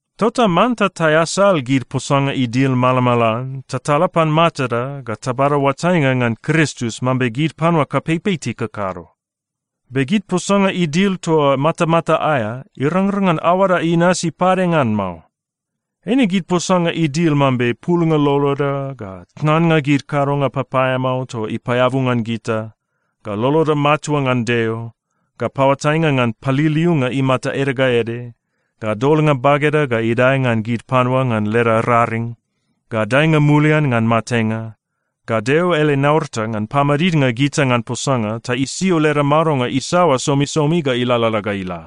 Tota manta taeasal gid posanga idil malamalan ta tala pan matada ga tabada oatainga ngan Kristus mambe gid panua kapeipei tikakado. Be gid posanga idil toa matamata aea, irangrang ngan aoada inasi pade ngan mao. Eine gid posanga idil mambe pulnga loloda, ga tnannga gid kadonga papaeamao toa ipaeabu ngan gita, ga loloda matua ngan Deo, ga paoatainga ngan paliliunga imata ede ga ede, ga dolnga bageda ga idae ngan gid panua ngan leda raring, ga daenga mulian ngan matenga, ga Deo ele naurata ngan pamadidnga gita ngan posanga ta isio leda madonga isaoa somisomi ga ilalala ga ila.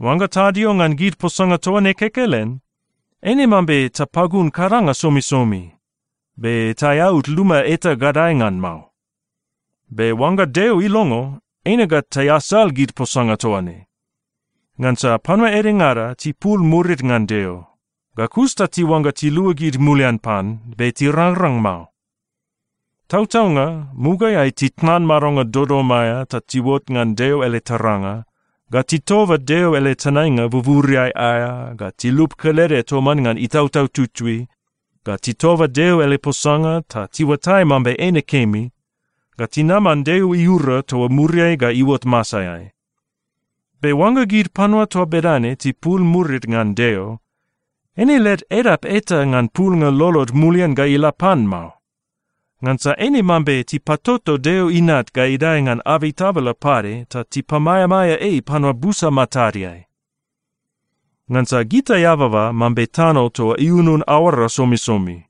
Oangga tadio ngan gid posanga toa ne kekelen, eine mambe tapagun kadanga somisomi, be taeaud luma eta gadae ngan mao. Be oangga Deo ilongo, eine ga taeasal gid posanga toa ne. Ngansa panua edengada tipul murid ngan Deo, ga kus ta tiuangga tiluagid mulian pan, be tirangrang mao. Tautaunga, mugaeai titnan madonga dodom aea ta tiuot ngan Deo ele taranga, ga titoba Deo ele tenainga buburiai aea, ga tilup kelede toman ngan Itautau Tutui, ga titoba Deo ele posanga ta tiuatai mambe eine kemi, ga tinaman Deo iura toa muriai ga iuot masaeai. Be oangga gid panua toa bedane tipul murid ngan Deo, eine led edap eta ngan pulnga lolod mulian ga ila pan mao. Ngansa eine mambe tipatoto Deo Inat ga idae ngan abei tabala pade ta tipamaeamaea ei panua busa matadeai. Ngansa gita eababa mambe tano toa iunun aoara somisomi.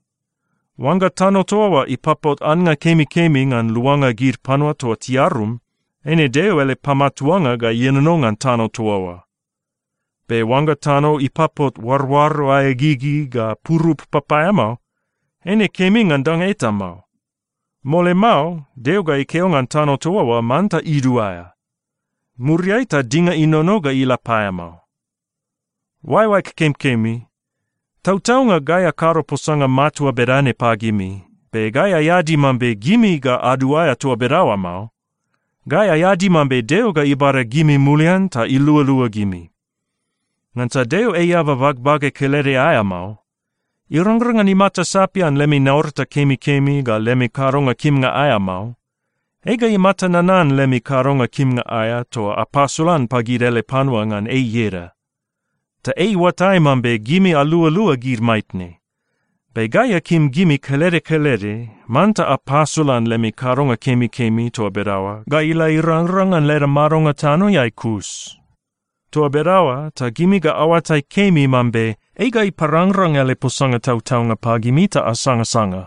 Oangga tano toa oa ipapot annga kemikemi ngan luanga gid panua toa tiarum, eine Deo ele pamatuanga ga ienono ngan tano toa oa. Be oangga tano ipapot oaroaro aea gigi ga purup papaeamao, eine kemi ngan danga eta mao. Mole mao Deo ga ikeo ngan tano toa oa manta iduaea. Muriai ta dinga inono ga ila paeamao. Oaeoaeg kemikemi, tautaunga gai akado posanga matua bedane pagimi, be gai aeadi mambe gimi ga aduaea toa bedaoa mao. Gai aeadi mambe Deo ga ibada gimi mulian ta ilualua gimi. Ngansa Deo ei eaba bagbage kelede aea mao. Irangrang ngan imata sapian lemi naurata kemikemi ga lemi kadonga kimnga aea mao. Ei ga imata nanan lemi kadonga kimnga aea toa apasolan pagid ele panua ngan ei ieda. Ta ei iuatai mambe gimi alualua gid maitne. Be gai akim gimi kelede kelede manta apasolan lemi kadonga kemikemi toa bedaoa ga ila irangrang ngan leda madonga tanoeai kus. Toa bedaoa ta gimi ga aoatai kemi mambe ei ga iparangrang ele posanga tautaunga pagimi ta asangasanga.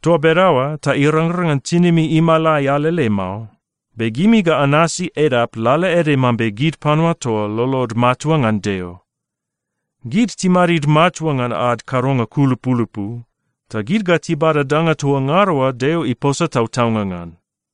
Toa bedaoa ta irangrang ngan tinimi imalai alele mao, be gimi ga anasi edap lalaede mambe gid panua toa lolod matua ngan Deo. Gid timadid matua ngan ad kadonga kulupulupu, ta gid ga tibada danga toa ngada oa Deo iposa tautaunga ngan.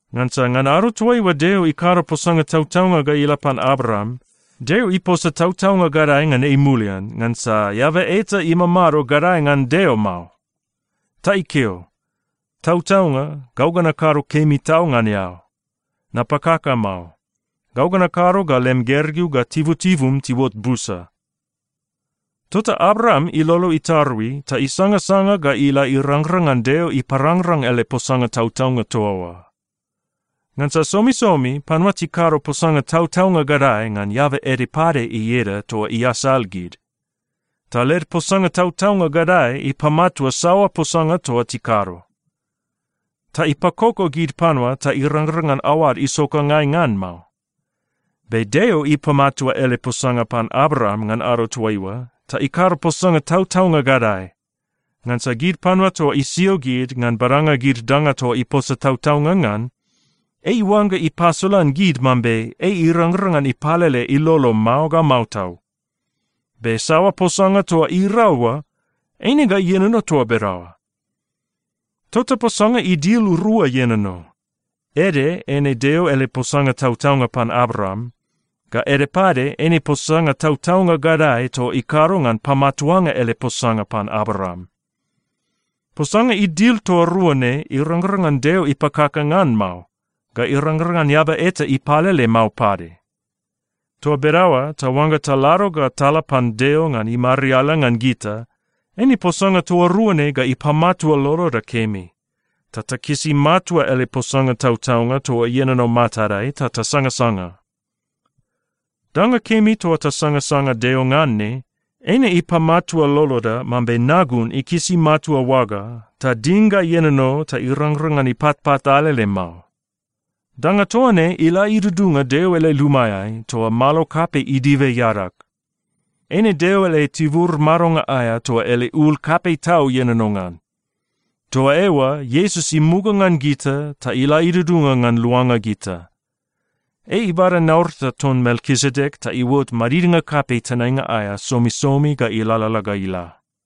Ngansa ngan ado toaiua Deo ikado posanga tautaunga ga ila pan Abraam, Deo iposa tautaunga gadae ngan ei mulian ngansa eaba eta imamado gadae ngan Deo mao. Ta ikeo, “Tautaunga, gau ga nakado kemi tau ngan eao. Napakaka mao. Gau ga nakado ga lem gergeu ga tibutibum tiuot busa.” Tota Abraam ilolo itarui ta isangasanga ga ila irangrang ngan Deo iparangrang ele posanga tautaunga toa oa. Ngansa somisomi panua tikado posanga tautaunga gadae ngan eaba ede pade ieda toa iasal gid. Ta led posanga tautaunga gadae ipamatua saoa posanga toa tikado, ta ipakoko gid panua ta irangrang ngan aoad isokangai ngan mao. Be Deo ipamatua ele posanga pan Abraam ngan ado toaiua ta ikado posanga tautaunga gadae, ngansa gid panua toa isio gid ngan badanga gid danga toa iposa tautaunga ngan, ei iuangga ipasolan gid mambe ei irangrang ngan ipalele ilolo mao ga mao tau. Be saoa posanga toa irau oa, eine ga ienono toa bedaoa. Tota posanga idil rua ienono. Ede eine Deo ele posanga tautaunga pan Abraam, ga ede pade eine posanga tautaunga gadae toa ikado ngan pamatuanga ele posanga pan Abraam. Posanga idil toa rua ne irangrang ngan Deo ipakaka ngan mao, ga irangrang ngan eaba eta ipalele mao pade. Toa bedaoa ta oangga talado ga tala pan Deo ngan imariala ngan gita, eine posanga toa rua ne ga ipamatua loloda kemi, ta takisi matua ele posanga tautaunga toa ienono matadai ta tasangasanga. Danga kemi toa tasangasanga Deo ngan ne, eine ipamatua loloda mambe nagun ikisi matua oaga ta ding ga ienono ta irangrang ngan ipatpat alele mao. Danga toa ne ila idudunga Deo ele lumaeai, toa malo kapei idibe iadag. Eine Deo ele tibur madonga aea toa ele ul kapei tau ienono ngan. Toa eoa Iesus imuga ngan gita ta ila idudunga ngan luanga gita. Ei ibada naurata ton Melkisedek ta iuot madidnga kapei tenainga aea somisomi ga ilalala ga ila.